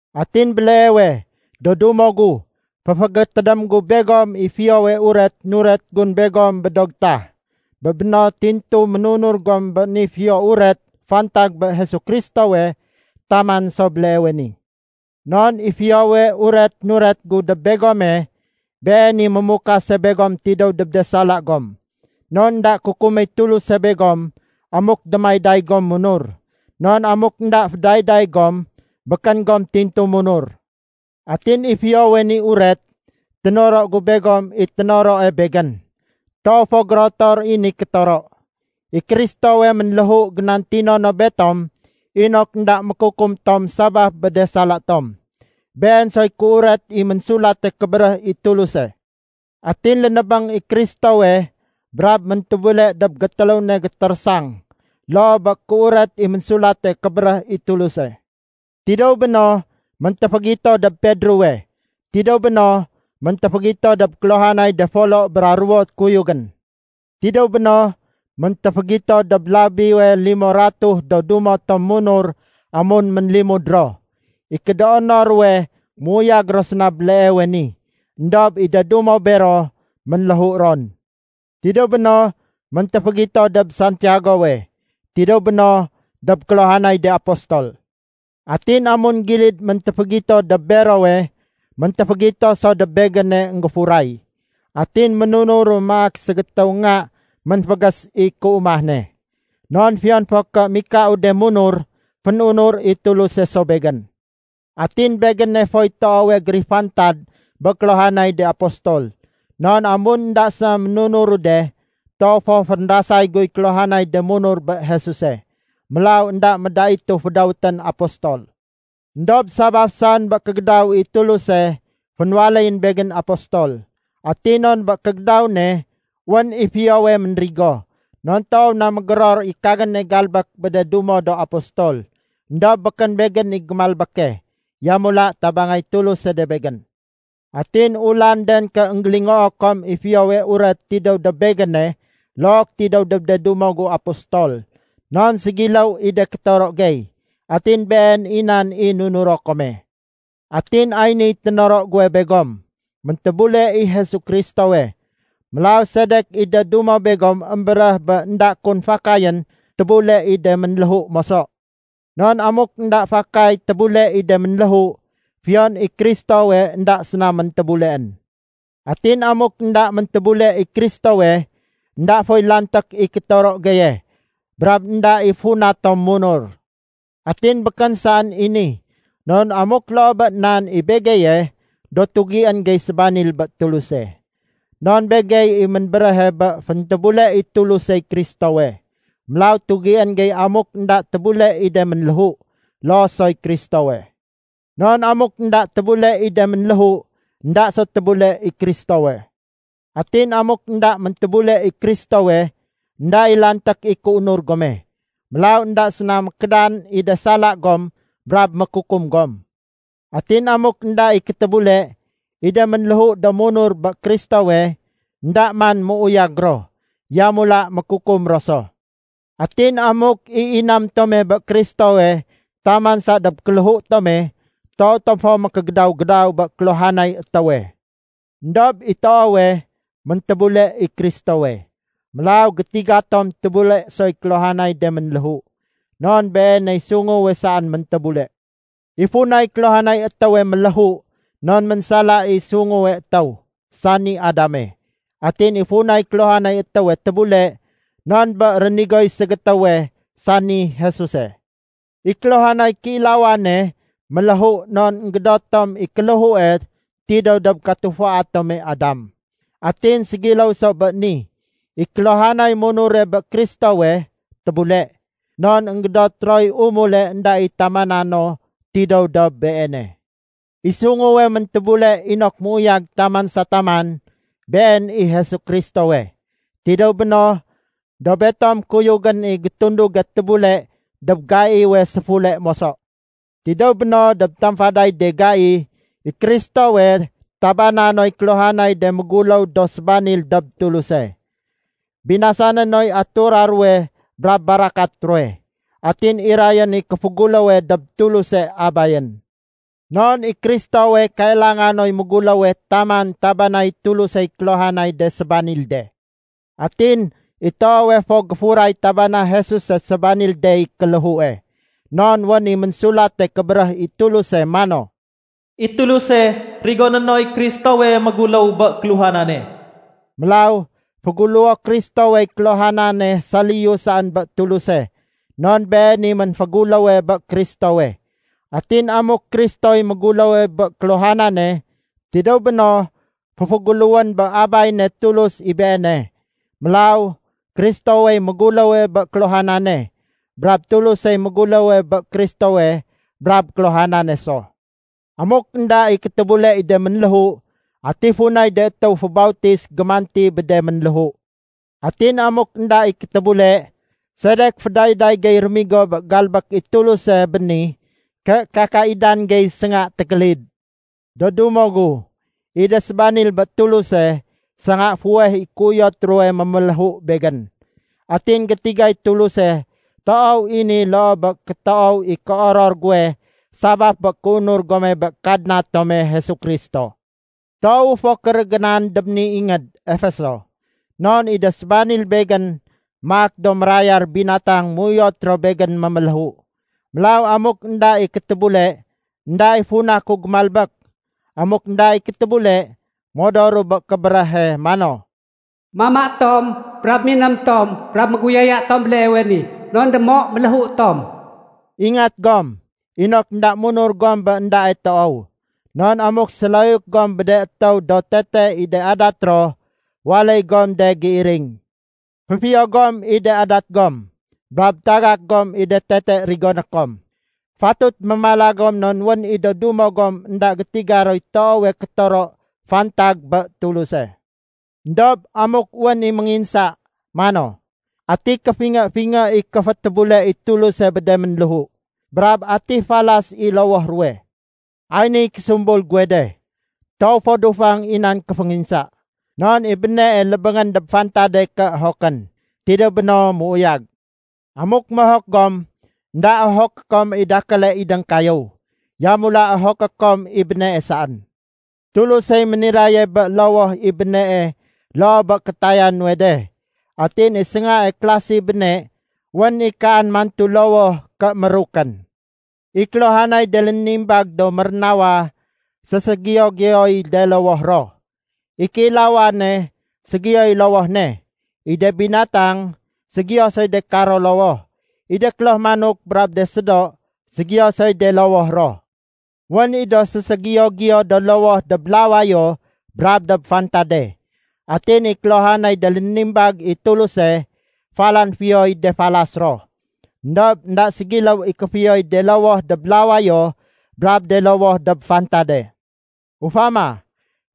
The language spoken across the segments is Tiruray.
Atin béleewe, do dumo gu, féfégétédém gu begom i Fiyowe Uret nuret gun begom bé do getah. Bé béno tintu ménunur gom bé ni Fiyo Uret fantag bé Jesu Kristowe taman so béleewe ni. Non i Fiyowe Uret nuret gu dob begome, been i mémukase begom tidéw dob de sala gom. Non énda kukuméy Tuluse begom amuk démayday gom munur. Non amuk énda fédayday gom, békén gom tintu munur. Atin i Fiyowe ni Uret, ténoro gu begom i ténoroe begén. Toow fo gérotor i ni kétoro. I Kristowe ménléhu génantino no betom inok énda mékukum tom sabaf bé de sala tom. Been soy kéuret i Ménsulate Kébéréh i Tuluse. Atin lénébéng i Kristowe brab méntébule dob gétéléw ne gétérésang loo bé kéuret i Ménsulate Kébéréh i Tuluse. Tidéw béno, méntéfégito dob Pedrowe. Tidéw béno, méntéfégito dob kéluhanay de folo bra ruwo kuyugén. Tidéw béno, méntéfégito dob labiwe limo ratuh do dumo tom munur amun ménlimud ro. I kédoono ruwe méuyag ro séna béleewe ni, éndob i de dumo bero ménléhu ron. Tidéw béno, méntéfégito dob Santiagowe. Tidéw béno dob kéluhanay de apostol. Atin amun gilid méntéfégito dob berowe, méntéfégito so dob begéne énggéfuray. Atin ménunuru maak ségétéwu nga ménfégés i kéumah ne. Non fiyon fo ké mikau de munur, fén-unur i Tuluse so begén. Atin begéne foy toowe gérifantad bé kéluhanay de apostol, non amun énda séna munuru de, toow fo fénrasay guy kéluhanay de munur bé Jesuse. Mélaw énda médaitu fédawétén apostol. Endob sabaf saén bé kégédaw i Tuluse, fénwaléyén begén apostol. Atin non bé kégédaw ne, wén i fiyowe ménrigo. Non toow na mégéror i kagéne galbék bé de dumo do apostol. Endob békén begén i gémalbéke. Yamula tabangay Tuluse de begén. Atin ulanden ké énggélingoo kom i Fiyowe Uret tidéw dob begéne look tidéw dob de dumo gu apostol. Non ségiléw i de kétoro gey. Atin been i nan i nunuro kome. Atin ay niy ténoro guwe begom: Méntébule i Jesu Kristowe. Mélaw sedek i de dumo begom émbéréh bé énda kun fakayén tébule i de ménléhu moso? Non amuk énda fakay tébule i de ménléhu, fiyon i Kristowe énda séna méntébuleén. Atin amuk énda méntébule i Kristowe, énda foy lanték i kétoro geye brab énda i funa tom munur. Atin békén saén i ni, non amuk loo bé nan i begeye, do tugién gey sébanil bé Tuluse. Non begey i ménbéréhe bé féntébule i Tulusey Kristowe. Mélaw tugién gey amuk énda tébule i de ménléhu, loo soy Kristowe. Non amuk énda tébule i de ménléhu, énda so tébule i Kristowe. Atin amuk énda méntébule i Kristowe, énda i lanték i kéunur gome. Mélaw énda séna mékédan i de sala gom brab mékukum gom. Atin amuk énda i kétébule, i de ménléhu do munur bé Kristowe, énda man méuyag ro, yamula mékukum ro so. Atin amuk i inam tome bé Kristowe taman saén dob kéléhu tome, toow tom fo mékégédaw-gédaw bé kéluhanay étéwe. Endob i toowe, méntébule i Kristowe. Mélaw gétiga tom tébule soy kéluhanay de ménléhu. Non Beeney sunguwe saén méntébule. I funay kéluhanay étéwe méléhu non ménsala i sunguwe étéw, sani Adame. Atin i funay kéluhanay étéwe tébule, non bé rénigoy ségétéwe sani Jesuse. I kéluhanay kéilawane méléhu non énggédot tom i kéléhue tidéw dob katufua tome Adam. Atin ségiléw so bé ni, i kéluhanay munure bé Kristowe tébule, non énggédot roy umule énda i tamana no tidéw dob Beene. I sunguwe méntébule inok méuyag taman sa taman, Been i Jesu Kristowe. Tidéw béno, do betom kuyugén i gétunduge tébule dob gaiwe séfule moso. Tidéw béno dob tamfaday de gai, i Kristowe tabana noy kéluhanay de méguléw do sébanil dob Tuluse. Binasané noy atura ruwe brab barakat ruwe. Atin irayén i kéféguléwe dob Tuluse Abayén. Non i Kristowe kailanga noy méguléwe taman tabanay Tulusey kéluhanay de sébanil de. Atin i toowe fo géfuray tabana Jesuse sébanil dey kéléhue. Non wén i Ménsulate Kébéréh i Tuluse mano, “I Tuluse rigoné noy Kristowe méguléw bé kéluhanane.” Mélaw féguléwo Kristowey kéluhanane saliyu saén bé Tuluse, non Been i ménféguléwe bé Kristowe. Atin amuk Kristoy méguléwe bé kéluhanane, tidéw béno féféguléwén bé Abay ne Tuluse i Beene. Mélaw Kristowey méguléwe bé kéluhanane, brab Tulusey méguléwe bé Kristowe brab kéluhanane so. Amuk énda i kétébule i de ménléhu, ati funay de étéw fébautis gémanti bé de ménléhu? Atin amuk énda i kétébule, sedek fédayday gey rémigo bé galbék i Tuluse béni ké kakaidan gey sénga tékélid? Do dumo gu, i de sébanil bé Tuluse, sénga fuweh i kéuyot ruwe méméléhu begén. Atin gétigay Tuluse toow i ni loo bé kétoow i kéoror guwe sabaf bé kéunur gome bé Kadna tome Jesu Kristo. Toowu fo kérégénan dob ni ingéd, Efeso. Non i de sébanil begén maak do mérayar binatang méuyot ro begén méméléhu. Mélaw amuk énda i kétébule, énda i funa ku gémalbék. Amuk énda i kétébule, modoru bé kébéréhe mano, “Mama tom, brab miném tom brab méguyaya tom béleewe ni, non démo méléhu tom.” Ingat gom inok énda munur gom bé éndae toow. Non amuk séloyuk gom bé de étéw do tete i de adat ro, waléy gom de géiring. Féfiyo gom i de adat gom, brab tagak gom i de tete rigoné kom. Fatut mémala gom non wén i do dumo gom énda gétiga roy toowe kétoro fantag bé Tuluse. Endob amuk wén i ménginsa mano, “Ati kéfingé-fingé i kéfétébule i Tuluse bé de ménléhu? Brab ati falas i lowoh ruwe?” Ay niy késumbul guwe de. Toow fo dufang i da nan kéfénginsa. Non i bénee lébéngén dob fantade ké ohokén. Tidéw béno, méuyag. Amuk mohok gom, énda ohoké kom i dakéle idéng kayéw, yamula ohoké kom i bénee saén. Tulusey méniraye bé lowoh i bénee loo bé kétaya nuwe de. Atin i séngae klase béne wén i kaan mantu lowoh ké mérukén. I kéluhanay de lénimbag do mérénawa, séségiyo-giyoy de lowoh ro. I kéilawane ségiyoy lowoh ne. I de binatang ségiyo soy de karo lowoh. I de kloh manok brab do sédo ségiyo soy de lowoh ro. Wén i do séségiyo-giyo do lowoh dob lawayo brab dob fantade. Atin i kéluhanay de lénimbag i Tuluse, falan fiyoy de falas ro. Endob énda ségiléw i kéfiyoy de lowoh dob lawayo brab de lowoh dob fantade. Ufama,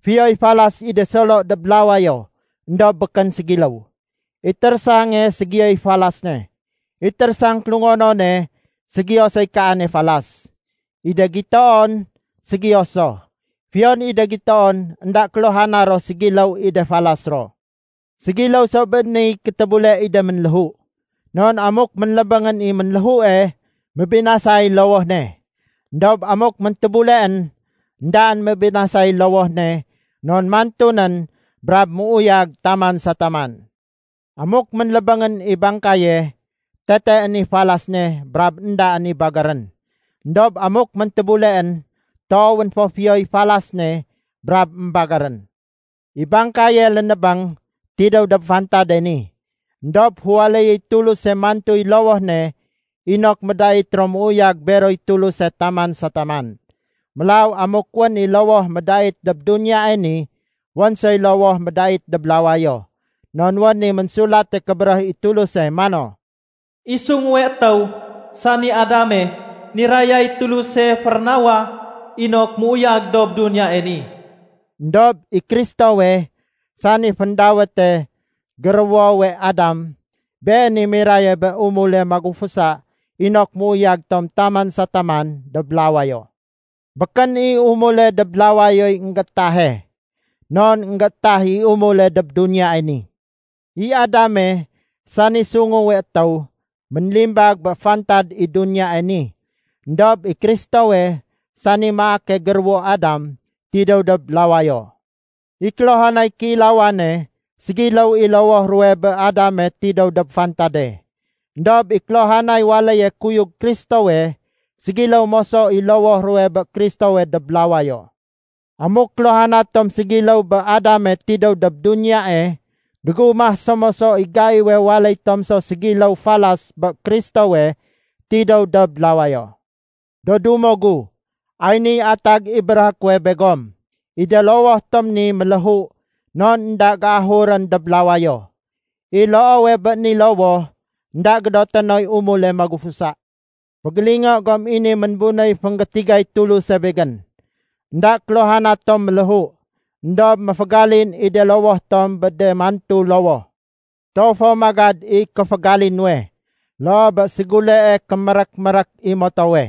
fiyoy falas i de solo dob lawayo éndob békén ségiléw. I térésange ségiyoy falas ne, i térésang kélungonone ségiyo soy kaane falas, i de gitoon ségiyo so. Fiyon i de gitoon énda kéluhana ro ségiléw i de falas ro. Ségiléw so bé niy kétébule i de ménléhu. Non amuk ménlébéngén i ménléhue, mébinasay lowoh ne. Endob amuk méntébuleén, éndaén mébinasay lowoh ne non mantu nén brab méuyag taman sa taman. Amuk ménlébéngén i bangkaye, teteén i falas ne brab éndaén i bagérén. Endob amuk méntébuleén, toowén fo fiyoy falas ne brab émbagérén. I bangkaye lénébéng, tidéw dob fantade ni. Endob féwaléyéy Tuluse mantuy lowoh ne inok médait ro méuyag beroy Tuluse taman sa taman. Mélaw amuk wén i lowoh médait dob duniyae ni, wén soy lowoh médait dob lawayo. Non wén i Ménsulate Kébéréh i Tuluse mano, “I sunguwe étéw, sani Adame, nirayay Tuluse férénawa inok méuyag dob duniyae ni.” Endob i Kristowe, sani féndawéte “Géruwowe Adam”, Been i miraye bé umule magufusa inok méuyag tom taman sa taman dob lawayo. Békén i umule dob lawayoy énggéétahe, non énggéétah i umule dob duniyae ni. I Adame, sani sunguwe étéw, ménlimbag bé fantad i duniyae ni. Endob i Kristowe, sani maake géruwo Adam, tidéw dob lawayo. I kéluhanay kéilawane, ségiléw i lowoh ruwe bé Adame tidéw dob fantade. Endob i kéluhanay waléye kuyug Kristowe, ségiléw moso i lowoh ruwe bé Kristowe dob lawayo. Amuk kéluhana tom ségiléw bé Adame tidéw dob duniyae, gégumah so moso i gaiwe waléy tom so ségiléw falas bé Kristowe tidéw dob lawayo. Do dumo gu, ay niy atag i béréhé kuwe begom. I de lowoh tom ni méléhu non énda géahurén dob lawayo. I loowe bé ni lowoh, énda gédoté noy umule magufusa. Fégélingo gom i ni ménbunéy fénggétigay Tuluse begén. Enda kéluhana tom méléhu, éndob méfégalin i de lowoh tom bé de mantu lowoh. Toow fo magad i kéfégali nuwe, loo bé ségulee kémérék-mérék i motowe,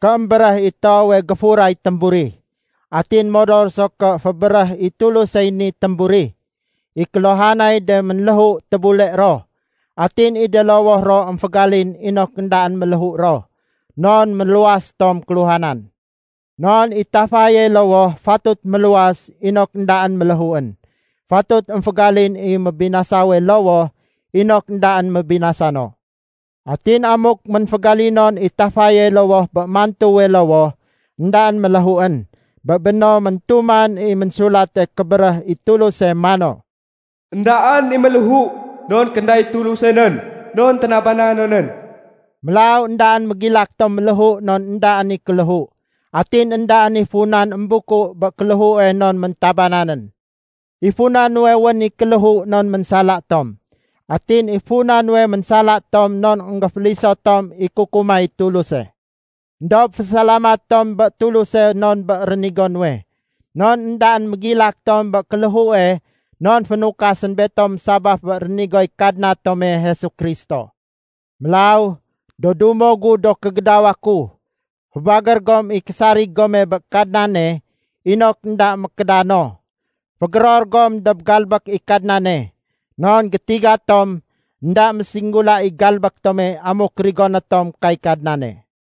ké émbéréh i toowe géfuray témburi. Atin modor so ké fébéréh i Tulusey ni témburi, i kéluhanay de ménléhu tébule ro. Atin i de lowoh ro émfégalin inok éndaén méléhu ro, non méluwas tom kéluhanan. Non i tafaye lowoh fatut méluwas inok éndaén méléhuén. Fatut émfégalin i mébinasawe lowoh inok éndaén mébinasa no. Atin amuk ménfégalinonén i tafaye lowoh bé mantuwe lowoh éndaén méléhuén, bé béno métumanén i Ménsulate Kébéréh i Tuluse mano, “Endaén i méléhu non kénday Tuluse nén non ténaba nonén.” Mélaw éndaén mégilak tom méléhu non éndaén i kéléhu. Atin éndaén i funan émbuku bé kéléhue non méntabananén. I funa nuwe wén i kéléhu non ménsala tom. Atin i funa nuwe ménsala tom non énggéféliso tom i kukumay Tuluse. Endob fésalamat tom bé Tuluse non bé rénigo nuwe. Non éndaén mégilak tom bé kéléhue non fénukasén betom sabaf bé rénigoy Kadna tome Jesu Kristo. Mélaw, do dumo gu do kégédawa ku, fébagér gom i késarig gome bé Kadnane inok énda mékédano. Fégéror gom dob galbék i Kadnane. Non gétiga tom énda mésinggula i galbék tome, amuk rigoné tom kay Kadnane.